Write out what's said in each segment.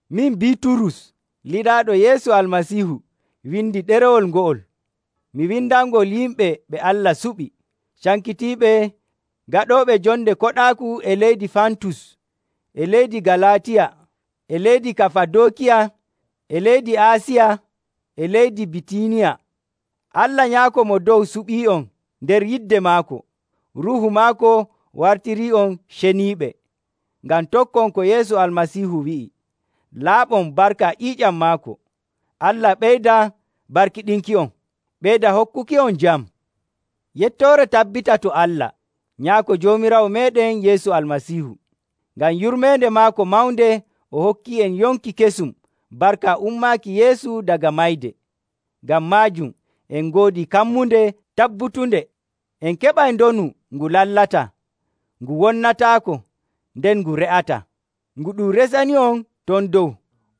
Min Biiturus lilaaɗo Yeesu Almasiihu windi ɗerewol ngo'ol. Mi windanngol yimɓe ɓe Allah suɓi, cankitiiɓe, gaɗooɓe jonde koɗaaku e leydi Fantus, e leydi Galaatiya, e leydi Kafadookiya, e leydi Aasiya, e leydi Bitiiniya. Allah Nyaako Mo Dow suɓii'on nder yidde maako. Ruuhu maako wartirii'on ceniiɓe, ngam tokkon ko Yeesu Almasiihu wi'i, laaɓon barka ƴiiƴam maako. Allah ɓeyda barkiɗinki'on, ɓeyda hokkuki'on jam. Yettoore tabbita to Allah, Nyaako Joomiraawo meeɗen Yeesu Almasiihu. Ngam yurmeende maako mawnde o hokkii'en yonki kesum barka ummaaki Yeesu daga mayde. Ngam maajum en ngoodi kammunde tabbutunde, en keɓay ndonu ngu lallataa, ngu wonnataako, nden ngu re'ataa, ngu ɗum resani'on ton dow.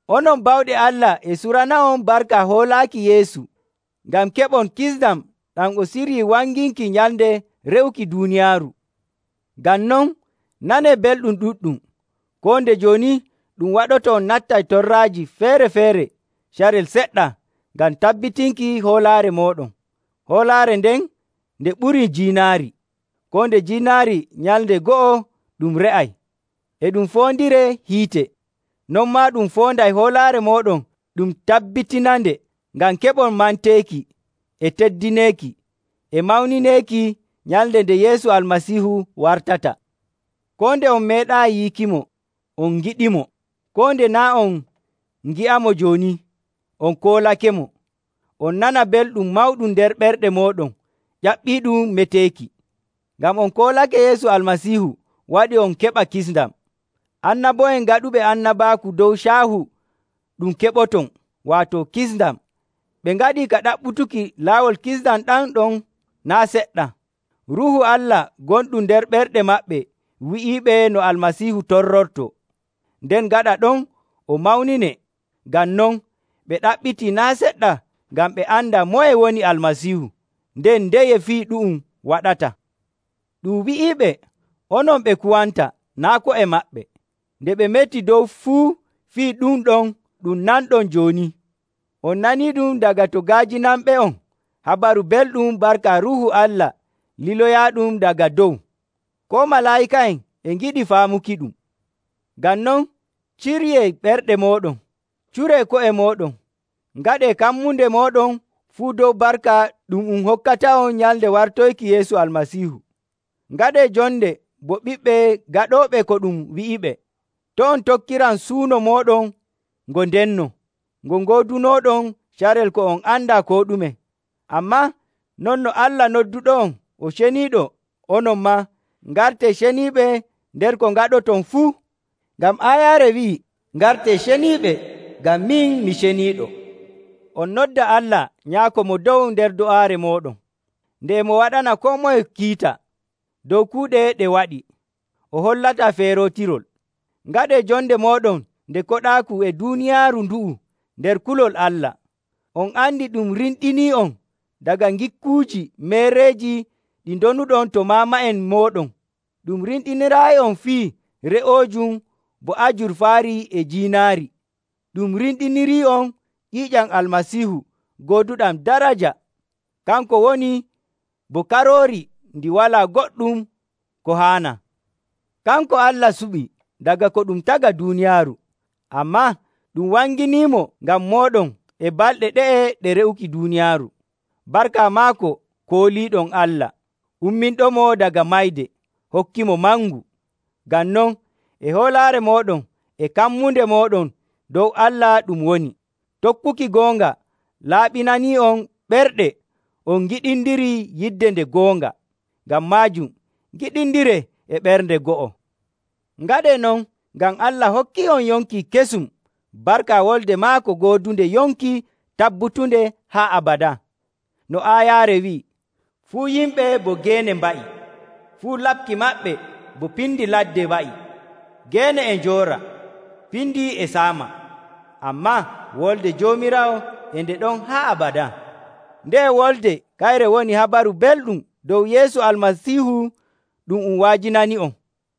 Onon bawɗe Allah e surana'on barka hoolaaki Yeesu, ngam keɓon kisndam ɗam o siryii wanginki nyalnde re'uki duuniyaaru. Ngam non, nanee belɗum ɗuɗɗum, koo nde jooni ɗum waɗoto on nattay torraaji feere‑feere carel seɗɗa ngam tabbitinki hoolaare mooɗon. Hoolaare nden nde ɓuri jiinaari. Koo nde jiinaari nyalnde go'o ɗum re'ay, e ɗum foondiree hiite. Non maa ɗum foonday hoolaare mooɗon ɗum tabbitinande ngam keɓon manteeki, e teddineeki, e mawnineeki nyalnde nde Yeesu Almasiihu wartata. Koo nde on meeɗaayi yiikimo, on ngiɗimo. Koo nde naa' on ngi'amo jooni, on koolakemo, on nana belɗum mawɗum nder ɓerɗe mooɗon ƴaɓɓiiɗum meteeki. Ngam on koolake Yeesu Almasiihu waɗi on keɓa kisndam. Annabo'en gaɗuɓe annabaaku dow caahu ɗum keɓoton, waato kisndam, ɓe ngaɗii ka ɗaɓɓutuki laawol kisndam ɗam ɗon naa' seɗɗa. Ruuhu Allah gonɗum nder ɓerɗe maɓɓe wi'iiɓe no Almasiihu torrortoo, nden gaɗa ɗon o mawninee. Ngam non, ɓe ɗaɓɓitii naa' seɗɗa ngam ɓe anda moye woni Almasiihu, nden ndeye fii ɗu'um waɗata. Ɗum wi'iiɓe onon ɓe kuwanta naa' ko'e maɓɓe, nde ɓe meti dow fuu fii ɗum ɗon ɗum nanɗon jooni. On naniiɗum daga to ga'ajinanɓe'on Habaru Belɗum barka Ruuhu Allah liloyaaɗum daga dow. Koo malaa'ika'en e ngiɗi faamukiɗum. Ngam non, ciryee ɓerɗe mooɗon, curee ko'e mooɗon, ngaɗee kammunde mooɗon fuu dow barka ɗum um hokkata'on nyalnde wartoyki Yeesu Almasiihu. Ngaɗee jonde bo ɓiɓɓe gaɗooɓe ko ɗum wi'iɓe. To' on tokkiran suuno mooɗon ngo ndenno, ngo ngoodunooɗon carel ko on andaa koo ɗume. Ammaa non no Allah nodduɗo'on o ceniiɗo, onon maa, ngartee ceniiɓe nder ko ngaɗoton fuu. Ngam aayaare wi'ii, “Ngartee ceniiɓe, ngam min mi ceniiɗo.” On nodda Allah Nyaako Mo Dow nder do'aare mooɗon. Nde e mo waɗana koo moye kiita dow kuuɗe ɗe waɗi, o hollataa feerootirol, ngaɗee jonde mooɗon nde koɗaaku e duuniyaaru ndu'u nder kulol Allah. On andi ɗum rimɗinii'on daga ngikkuuji meereeji ɗi ndonuɗon to maama'en mooɗon. Ɗum rimɗiniraayi'on fii re'oojum bo ajurfaari e jiinaari. Ɗum rimɗinirii'on ƴiiƴam Almasiihu gooduɗam daraja. Kanko woni bo karoori ndi walaa goɗɗum ko haanaa. Kanko Allah suɓi daga ko ɗum taga duuniyaaru, ammaa ɗum wanginimo ngam mooɗon e balɗe ɗe'e ɗe re'uki duuniyaaru. Barka maako kooliiɗon Allah, umminɗomo daga mayde, hokkimo mangu. Ngam non, e hoolaare mooɗon e kammunde mooɗon dow Allah ɗum woni. Tokkuki goonga laaɓinanii'on ɓerɗe on ngiɗindiri yidde nde goonga. Ngam maajum, ngiɗindiree e ɓernde go'o. Ngaɗee non ngam Allah hokkii'on yonki kesum barka wolde maako goodunde yonki tabbutunde haa abadaa. No aayaare wi'i, “Fuu yimɓe bo geene mba'i, fuu laɓki maɓɓe bo piindi ladde wa'i. Geene e njoora, piindi e saama, ammaa Wolde Joomiraawo e nde ɗon haa abadaa.” Nde'e wolde kayre woni Habaru Belɗum dow Yeesu Almasiihu ɗum um wa'ajinani'on.